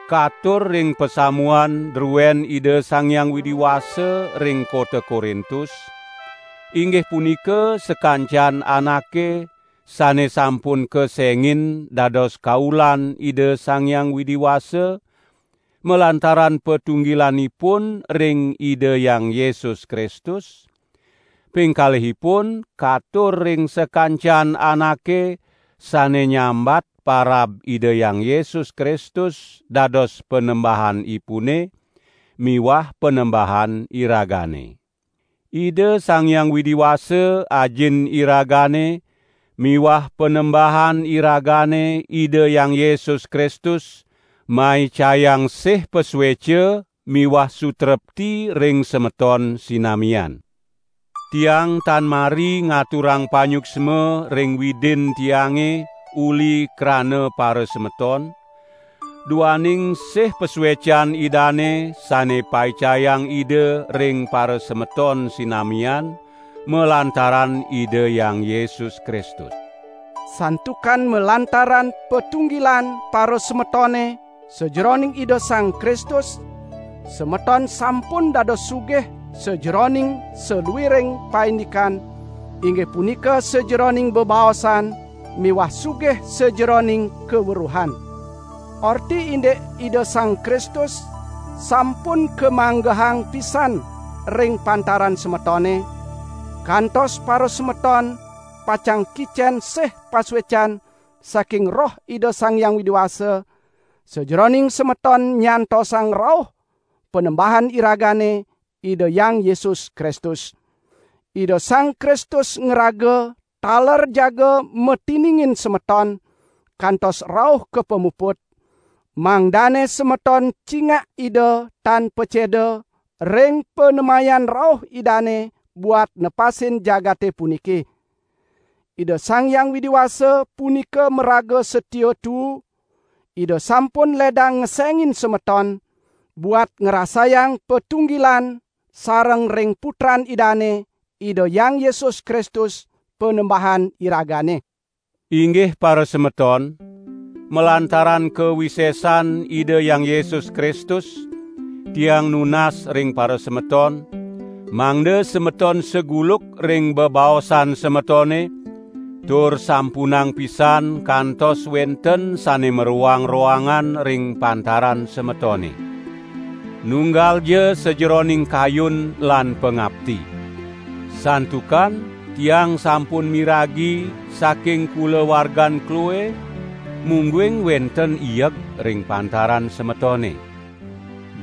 katur ring pasamuan druen Ida Sang Hyang Widi Wasa ring kota Korintus, inggih punika sakancan anake sane sampun kesengin dados kaulan Ida Sang Hyang Widi Wasa malantaran patunggilanipun ring Ida Hyang Yesus Kristus; ping kalihipun katur ring sakancan anake sane nyambat parab Ida Hyang Yesus Kristus dados Panembahanipune miwah Panembahan iragane. Ida Sang Hyang Widi Wasa Ajin iragane miwah Panembahan iragane Ida Hyang Yesus Kristus maicayang sih pasueca miwah sutrepti ring semeton sinamian. Tiang tan mari ngaturang panyuksma ring Widin tiange uli krana parasemeton, duaning sih pasuecan Idane sane paicayang Ida ring parasemeton sinamian, malantaran Ida Hyang Yesus Kristus. Santukan malantaran patunggilan parasemetone sajeroning Ida Sang Kristus, semeton sampun dados sugih sajeroning saluiring paindikan, inggih punika sajeroning bebaosan miwah sugih sajeroning kaweruhan. Orti indik Ida Sang Kristus sampun kamanggehang pisan ring pantaran semetone, kantos parasemeton pacang kicen sih pasuecan saking Roh Ida Sang Hyang Widi Wasa, sajeroning semeton nyantosang rauh Panembahan iragane, Ida Hyang Yesus Kristus. Ida Sang Kristus ngraga taler jaga matiningin semeton kantos rauh ka pamuput, mangdane semeton cingak Ida tan paceda ring panemayan rauh Idane buat nepasin jagate puniki. Ida Sang Hyang Widi Wasa punika maraga satia tuu, Ida sampun ledang ngesengin semeton buat ngrasayang patunggilan sareng ring Putran Idane, Ida Hyang Yesus Kristus, Panembahan iragane. Inggih parasemeton, malantaran kawisesan Ida Hyang Yesus Kristus, tiang nunas ring parasemeton, mangda semeton saguluk ring bebaosan semetone, tur sampunang pisan kantos wenten sane maroang-roangan ring pantaran semetone. Nunggalja sajeroning kayun lan pangapti. Santukan tiang sampun miragi saking kulawargan Kloe, mungguing wenten ieg ring pantaran semetone.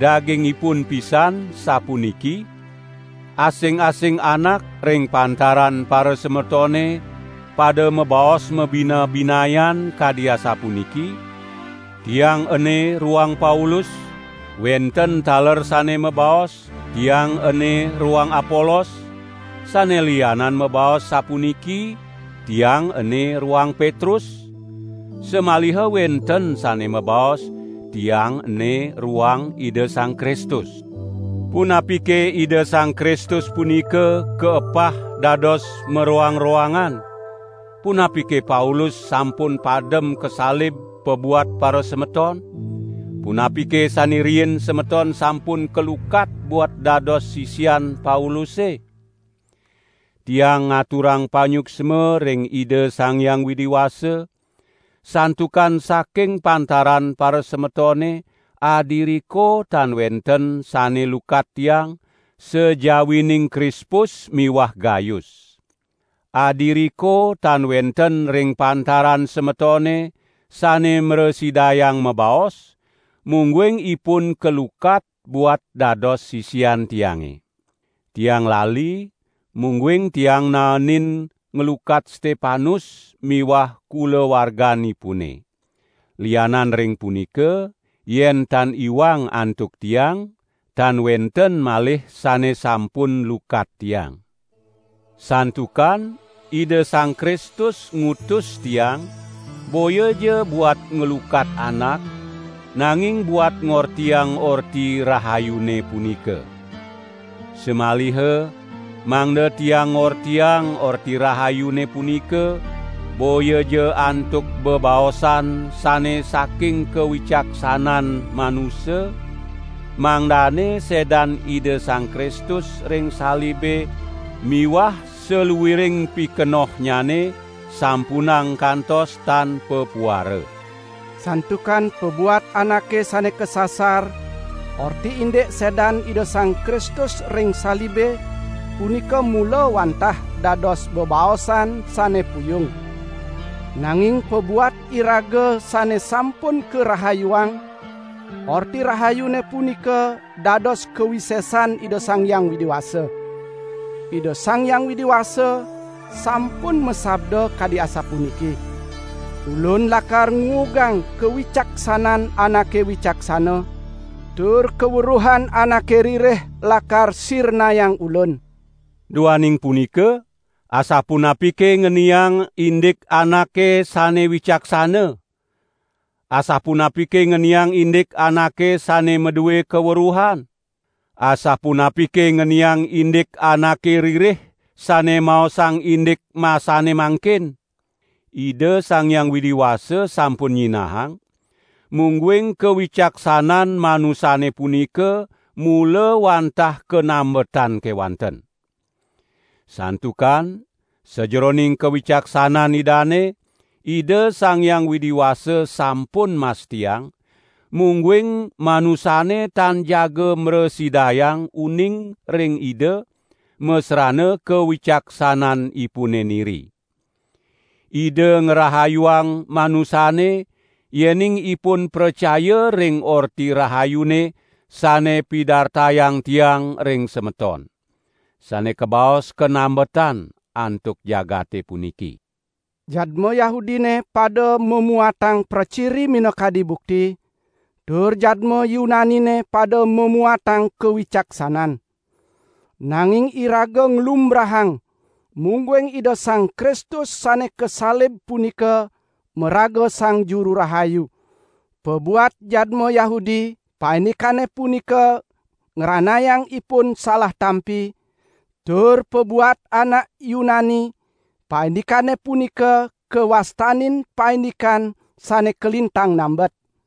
Dagingipun pisan sapuniki: Asing-asing anak ring pantaran parasemetone pada mabaos mabina-binayan kadi asapuniki: Tiang ene roang Paulus; wenten taler sane mabaos: Tiang ene roang Apolos; sane lianan mabaos sapuniki: Tiang ene roang Petrus; samaliha wenten sane mabaos: Tiang ene roang Ida Sang Kristus. Punapike Ida Sang Kristus punika kaepah dados maroang-roangan? Punapike Paulus sampun padem kasalib pabuat parasemeton? Punapike sane riin semeton sampun kalukat buat dados sisian Pauluse? Tiang ngaturang panyuksma ring Ida Sang Hyang Widi Wasa, santukan saking pantaran parasemetone adiriko tan wenten sane lukat tiang, sajawining Krispus miwah Gayus. Adiriko tan wenten ring pantaran semetone sane mrasidayang mabaos, mungguing ipun kalukat buat dados sisian tiange. ( Tiang lali, mungguing tiang naenin nglukat Stepanus miwah kulawarganipune. Lianan ring punika, yen tan iwang antuk tiang, tan wenten malih sane sampun lukat tiang.) Santukan Ida Sang Kristus ngutus tiang boyaja buat nglukat anak, nanging buat ngortiang Orti Rahayune punika. Samaliha mangda tiang ngortiang Orti Rahayune punika boyaja antuk bebaosan sane saking kawicaksanan manusa, mangdane sedan Ida Sang Kristus ring salibe miwah saluiring pikenohnyane sampunang kantos tan papuara. Santukan pabuat anake sane kasasar orti indik sedan Ida Sang Kristus ring salibe punika mula wantah dados bebaosan sane puyung. Nanging pabuat iraga sane sampun karahayuang, Orti Rahayune punika dados kawisesan Ida Sang Hyang Widi Wasa. Ida Sang Hyang Widi Wasa sampun masabda kadi asapuniki: "Ulun lakar nguugang kawicaksanan anake wicaksana, tur kaweruhan anake ririh lakar sirnayang Ulun." Duaning punika asapunapike ngeniang indik anake sane wicaksana? Asapunapike ngeniang indik anake sane madue kaweruhan? Asapunapike ngeniang indik anake ririh sane maosang indik masane mangkin? Ida Sang Hyang Widi Wasa sampun nyinahang, mungguing kawicaksanan manusane punika mula wantah kanambetan kewanten! Santukan sajeroning kawicaksanan Idane, Ida Sang Hyang Widi Wasa sampun mastiang, mungguing manusane tan jaga mrasidayang uning ring Ida masrana kawicaksananipune niri. Ida ngrahayuang manusane yening ipun pracaya ring Orti Rahayune sane pidartayang tiang ring semeton (sane kabaos kanambetan antuk jagate puniki). Jadma Yahudine pada mamuatang praciri minakadi bukti, tur jadma Yunanine pada mamuatang kawicaksanan. Nanging iraga nglumbrahang, mungguing Ida Sang Kristus sane kasalib punika maraga Sang Juru Rahayu; pabuat jadma Yahudi paindikane punika ngranayang ipun salah tampi, tur pabuat anak Yunani paindikane punika kawastanin paindikan sane kalintang nambet.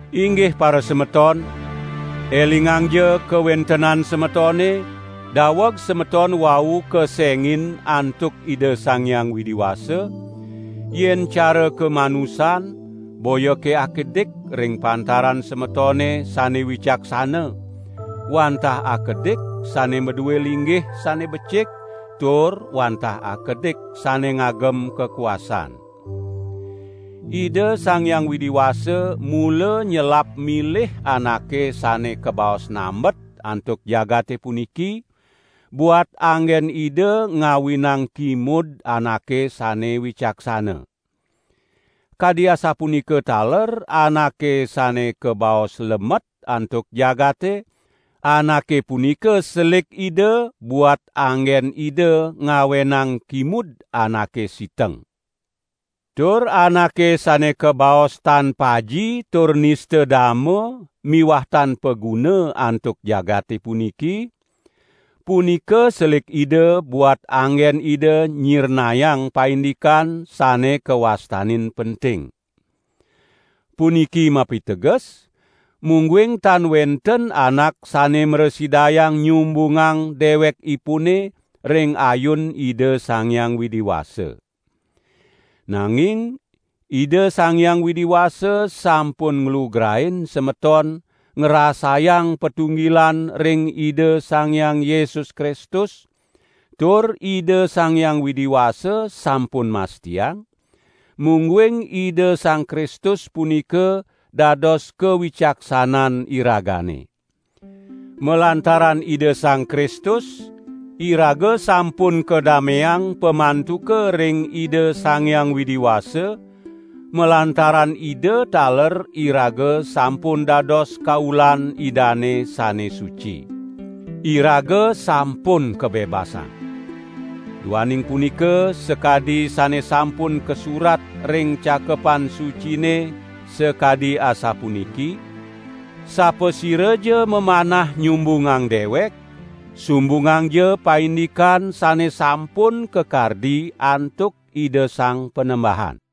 Inggih parasemeton, elingangja kawentenan semetone, daweg semeton wau kesengin antuk Ida Sang Hyang Widi Wasa; yen cara kamanusan boyake akedik ring pantaran semetone sane wicaksana, wantah akedik sane madue linggih sane becik tur wantah akedik sane ngagem kakuasan. Ida Sang Hyang Widi Wasa mula nyelap milih anake sane kabaos nambet antuk jagate puniki, buat anggen Ida ngawinang kimud anake sane wicaksana. Kadi asapunika taler anake sane kabaos lemet antuk jagate, anake punika selik Ida buat anggen Ida ngawenang kimud anake siteng. Tur anake sane kabaos tan paji tur nista dama miwah tan paguna antuk jagate puniki, punika selik Ida buat anggen Ida nyirnayang paindikan sane kawastanin penting. Puniki mapiteges, mungguing tan wenten anak sane mrasidayang nyumbungang dewekipune ring ayun Ida Sang Hyang Widi Wasa. Nanging Ida Sang Hyang Widi Wasa sampun nglugrain semeton ngrasayang patunggilan ring Ida Sang Hyang Yesus Kristus tur Ida Sang Hyang Widi Wasa sampun mastiang, mungguing Ida Sang Kristus punika dados kawicaksanan iragane. Malantaran Ida Sang Kristus iraga sampun kadameang pamantuka ring Ida Sang Widi Wasa; malantaran Ida taler iraga sampun dados kaulan Idane sane suci. Iraga sampun kabebasang! Duaning punika sakadi sane sampun kasurat ring Cakepan Sucine sakadi asapuniki: "Sapasiraja mamanah nyumbungang dewek, sumbungangja paindikan sane sampun kakardi antuk Ida Sang Panembahan."